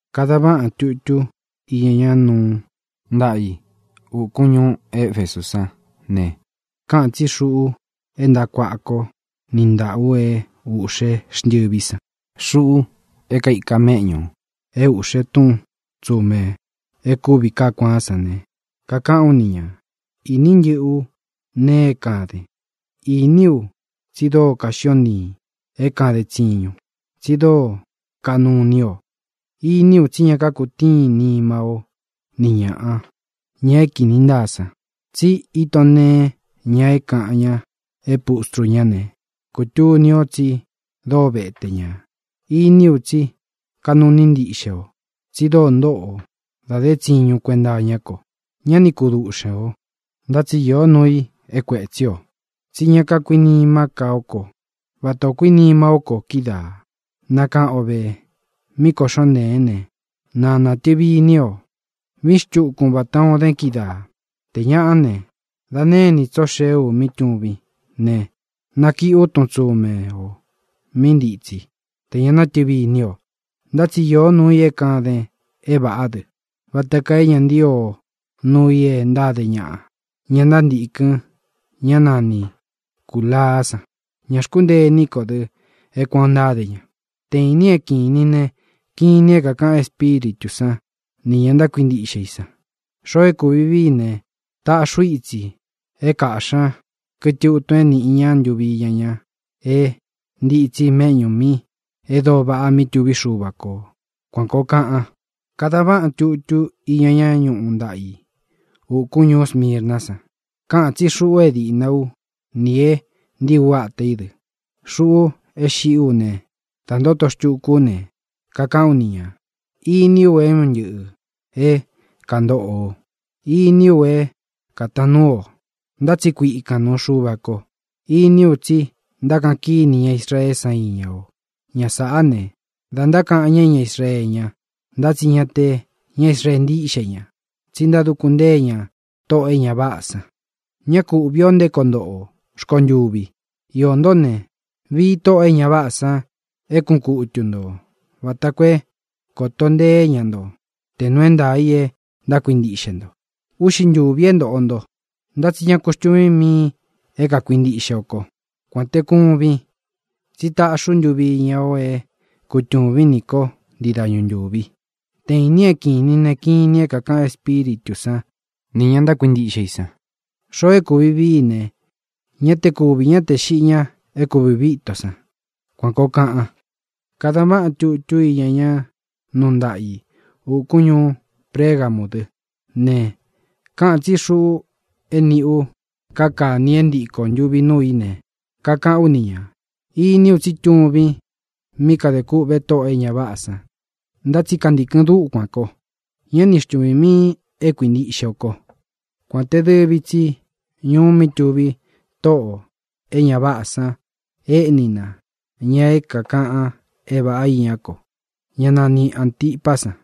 ʼKadan váꞌan tutú iña ñá nuu ntaꞌa i ūkún ñuú Efesú san ne, káꞌān tsí Xuꞌu é ntaꞌa kuāꞌa kó niꞌi ntāꞌa ú é ūꞌxé xntɨví san, Xuꞌu é kaika méꞌñū ú é ūꞌxe tún tsumē e kúvi kaá kuaán san ne, kakaꞌán u ni ñā: Ini ntɨ́ꞌɨ ú nee é kāden. Iní u tsi dóo kaxión ntiīn é kāden tsiñun, tsi dóo kaꞌnu iní o. Iní u tsí ña kakutíin nima ó ni ñāꞌa, ña é kīni ntáa san, tsi íton nteén ña é kāꞌan ña é pustru ñá ne, kūtuni o tsi dóo vete ñā. Iní u tsí kaꞌnu iní ntiꞌxe o, tsi dóo ntóꞌo o da dé tsiñun kuenta iñá ko; ñá ni kuduꞌxen ō. Ntá tsi īó nuu i é kuētsí o: tsí ña kakuinimá ka o kó vata ō kuínima ó ko kídaā. Nakáꞌan o vē míꞌī koꞌxón nteen ne, na nātɨvi iní o. Vīín xtukun vatā o dén kídaā. Tē ñaꞌá ne, da née inī tso xee u mí tuvín ne, nakiꞌi ú tun tsume ō mí ntitsi, tē ña nátɨvi iní o. Ntá tsi īó nuu i é kāden é vāꞌá dɨ, vata kaa é ña ntío o nuu i e ntáde ñaꞌa, ña ntántīkɨn ñá nani Cūlaá san. Ña xkúntee iní ko dɨ é kuān o ntáde ña. ¡Te īnin é kīnin ne, kinin é kākaꞌan Espíritū sán nī ña ntákuintiꞌxe i san! Xoo é kūvi vií i ne, taꞌxí u itsi é kāꞌxi ña kɨtɨ utun é nīꞌi ña ntuvi iña ña é ntītsí mēꞌñu mí e dóo vaꞌa mí tuví Xuva kō. Kuān koo kaꞌan. ʼKadan váꞌan tutú iña ñá nuu ntaꞌa i ūkún ñuú Smirná san. Káꞌān tsí Xuꞌu é dīꞌna ú nī e ntíi ú ata í dɨ, Xuꞌu é xiꞌí u ne da ntóto xtúku ú ne, kakaꞌán u ni ñā: Iní u é un ntɨꞌɨ̄ é kāntóꞌo o. Iní u é kātaan núu o, ntá tsi kuikān nuu Xuva ko. Iní u tsí ntákaꞌan kíni ña Israeé san iña o. Ña sāꞌá ne, da ntákaꞌan ña é ña Israeé ña, ntá tsi ña te ña Israee ntíꞌxe ña, tsi ntáduku ntée ña tóꞌō e ña váꞌā san. Ña ku úꞌvī o nté koo ntoꞌo o rkontuvi. Iō ntó ne, vii tóꞌō e ña váꞌā san é kuꞌun kutu ntō vata koo é kōto nteé ña nto tē nuu é ntaā i e ntákuintiꞌxe nto. Úꞌxi ntūvi é ntōꞌo nto. Ntá tsi ñá ku xtuvīn miin é kākuintiꞌxe o kó, kuān te kuvin, tsí taꞌxí u ntuvi iña o é kutūvín nī kó ntii dañu ntūvi. ¡Te īnin é kīnin ne, kinin é kākaꞌan Espíritū sán nī ña ntákuintiꞌxe i san! Xoo é kūvi vií i ne, ña te kúvī ñá tē xiꞌi ña é kūvi uvi íto san. Kuān koo kaꞌan. ʼKadan váꞌan tutú iña ñá nuu ntaꞌa i ūkún ñuú Pregamú dɨ ne, káꞌān tsí Xuꞌu é nīꞌi u káa kāni é ntiko ntūvi núu í ne, kakaꞌán u ni ñā: Iní u tsí tuvin mí kadē kûꞌve tóꞌō e ña váꞌā san, ntá tsi kantīkɨn dúkuān ko. Ñá ni xtuvīn miin e kuíntiꞌxe o kó, kuān te dɨvi tsi ñuu mí tuví tóꞌō e ña váꞌā san éꞌní na ña é kākaꞌan é vāꞌá iñá ko, ñá nani Āntipá san.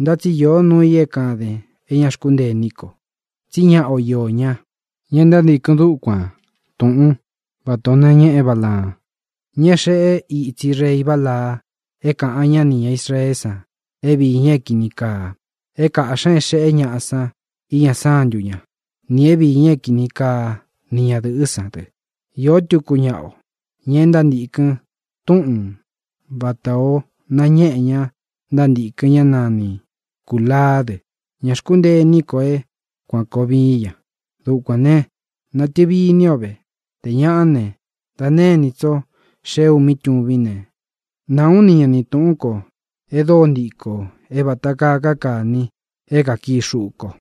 Ntá tsi īó nuu i é kāden é ña xkúntee iní ko: tsí ñaꞌa o iō ñá, ña e ntántīkɨn dúkuān túꞌun vatā o nañéꞌe Bálaan, ña é xeꞌe ítsi rei Balaa é kāꞌan ñá nī ña Israeé san é viī ña é kīni kaa: é kāꞌxi ña é xeꞌé ñaꞌa san iña sántu ñá, nī é viī ña é kini kaa ni ñadɨ̄ꞌɨ́ san dɨ. Iō túku ñaꞌa o, ña e ntántīkɨn túꞌun vatā o nañéꞌe ña ntántīkɨn ñá nani Cūlaá dɨ. Ña xkúntee iní ko é kuān koo vií ña. Dukuān ne, natɨvi iní o ve. Tē ñaꞌá ne, da née inī tsó xee u mí tuvín ne, náā ú ni ña ni tūꞌún ko e dóo ntiko é vāta kaa káa kāni é kākii xuꞌu ko.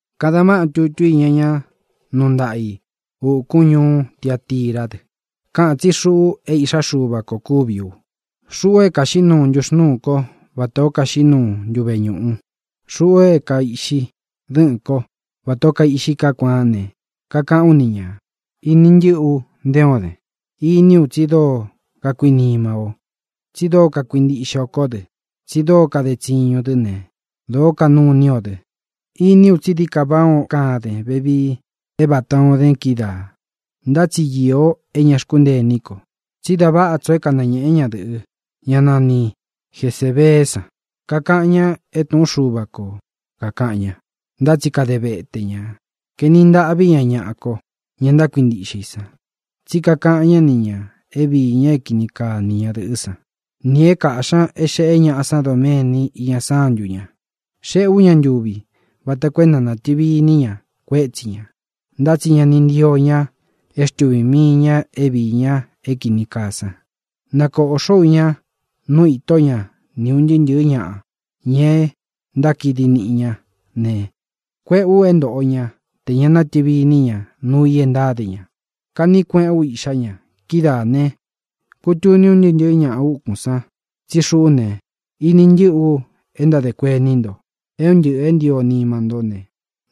ʼKadan váꞌan tutú iña ña nuu ntaꞌa i ūkún ñuú Tiatirá dɨ. Káꞌān tsí Xuꞌu é Iꞌxá Xuva kō kúvi u, Xuꞌu é kaiꞌxi ntúxnūú ko vatā ó kaxiꞌí nuu ntúve ñūꞌu, Xuꞌu é kaiꞌxi dɨ́ꞌɨ̄n kó vatā ó kaiꞌxi kaá kuaán ne, kakaꞌán u ni ñā: Ini ntɨ́ꞌɨ ú nte o den. Iní u tsi dóo kakuinima ó, tsi dóo kakuintiꞌxe o kó dɨ, tsi dóo kade tsiñun dɨ́ ne, dōó kaꞌnu iní o dɨ. Iní u tsi dií ka váꞌā ó kaden vevii é vatā o dén kídaā. Ntá tsi īó é ña xkúntee iní ko: tsí da váꞌa tso é kanañēꞌé ñadɨ̄ꞌɨ, ñá nani Jesēbeé san. Kakaꞌan ña é tūꞌún Xuva ko kākaꞌan ña, ntá tsi kade vete ñā. Kaeni ntaꞌví ña ñaꞌá ko, ña ntákuintiꞌxe i san, tsí kakaꞌan ñá ni ñā é viī ña é kini kaa ni ñadɨ̄ꞌɨ́ san, nī é kaꞌxī ña é xeꞌé ñaꞌa san doméni iña sántu ña. Xéꞌē ú ña ntuvi vata koo é na nātɨvi iní ña kuétsi ñā, ntá tsi ña ni ntío ña é xtuvī mii ña é viī ña é kīni kaa san. Nakōꞌxó u ña nu itó ña ni ūn ntɨɨ́ ntɨ̄ɨ́ ñaꞌa, ña e ntákidi niꞌi ñá ne, kuéꞌē u é ntōꞌo ñá tē ña nátɨvi iní ña nuu i e ntáde ña. Kaꞌní kueꞌén u iꞌxá ña. Kidáā ne, kutuni un ntɨɨ́ ntɨ̄ɨ́ ñaꞌa úkun san tsí xuꞌú ne, ini ntɨ́ꞌɨ u e ntádē kuení nto, é un ntɨꞌɨ̄ é ntio nima ntó ne,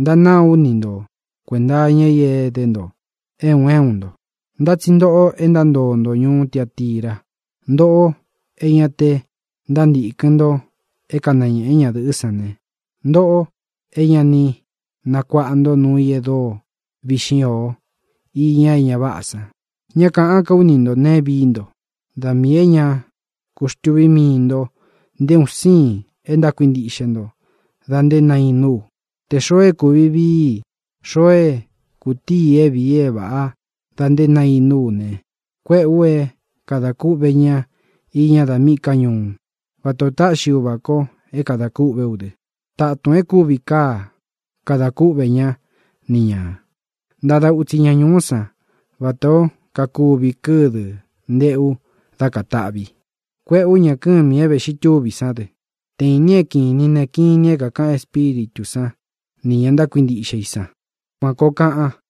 ntánāá u ni nto kuēnta iña i é edé nto é un é un nto. Ntá tsi ntoꞌo e ntántoo nto ñuú Tiatirá, ntōꞌo é ña te ntántīkɨn nto é kanañēꞌé ñadɨ̄ꞌɨ́ san ne, ntōꞌo é ña ni nakuaꞌa nto nuu i e dóo viꞌxín o iña é ña váꞌā san. Ñá kāꞌán ka ú ni ntō neé vií nto. Da miī é ña ku xtūví mii nto nté un siin e ntákuintiꞌxe nto da nté nainú u. Tē xoo é kūvi vií i, xoo é kūtií i é vīi é vāꞌa da nté nainú u ne, kuéꞌē u é kadā kúꞌvē ñá iña da míꞌī ká ñuú, vatā o táꞌxi Uvā ko é kadā kûꞌvé u dɨ. Tátūn e kúvi káa kada kúꞌvē ñá ni ñā. Ntada utsi ña ñūú san vatā ó kakuvi kɨ́dɨ̄ nteꞌu dá kātaꞌvi. Kuéꞌē ú ña kɨ́mī é vēꞌxi túvi sán dɨ. ¡Te īnin é kīnin ne, kinin é kākaꞌan Espíritū sán nī ña ntákuintiꞌxe i san! Kuān koo kaꞌan.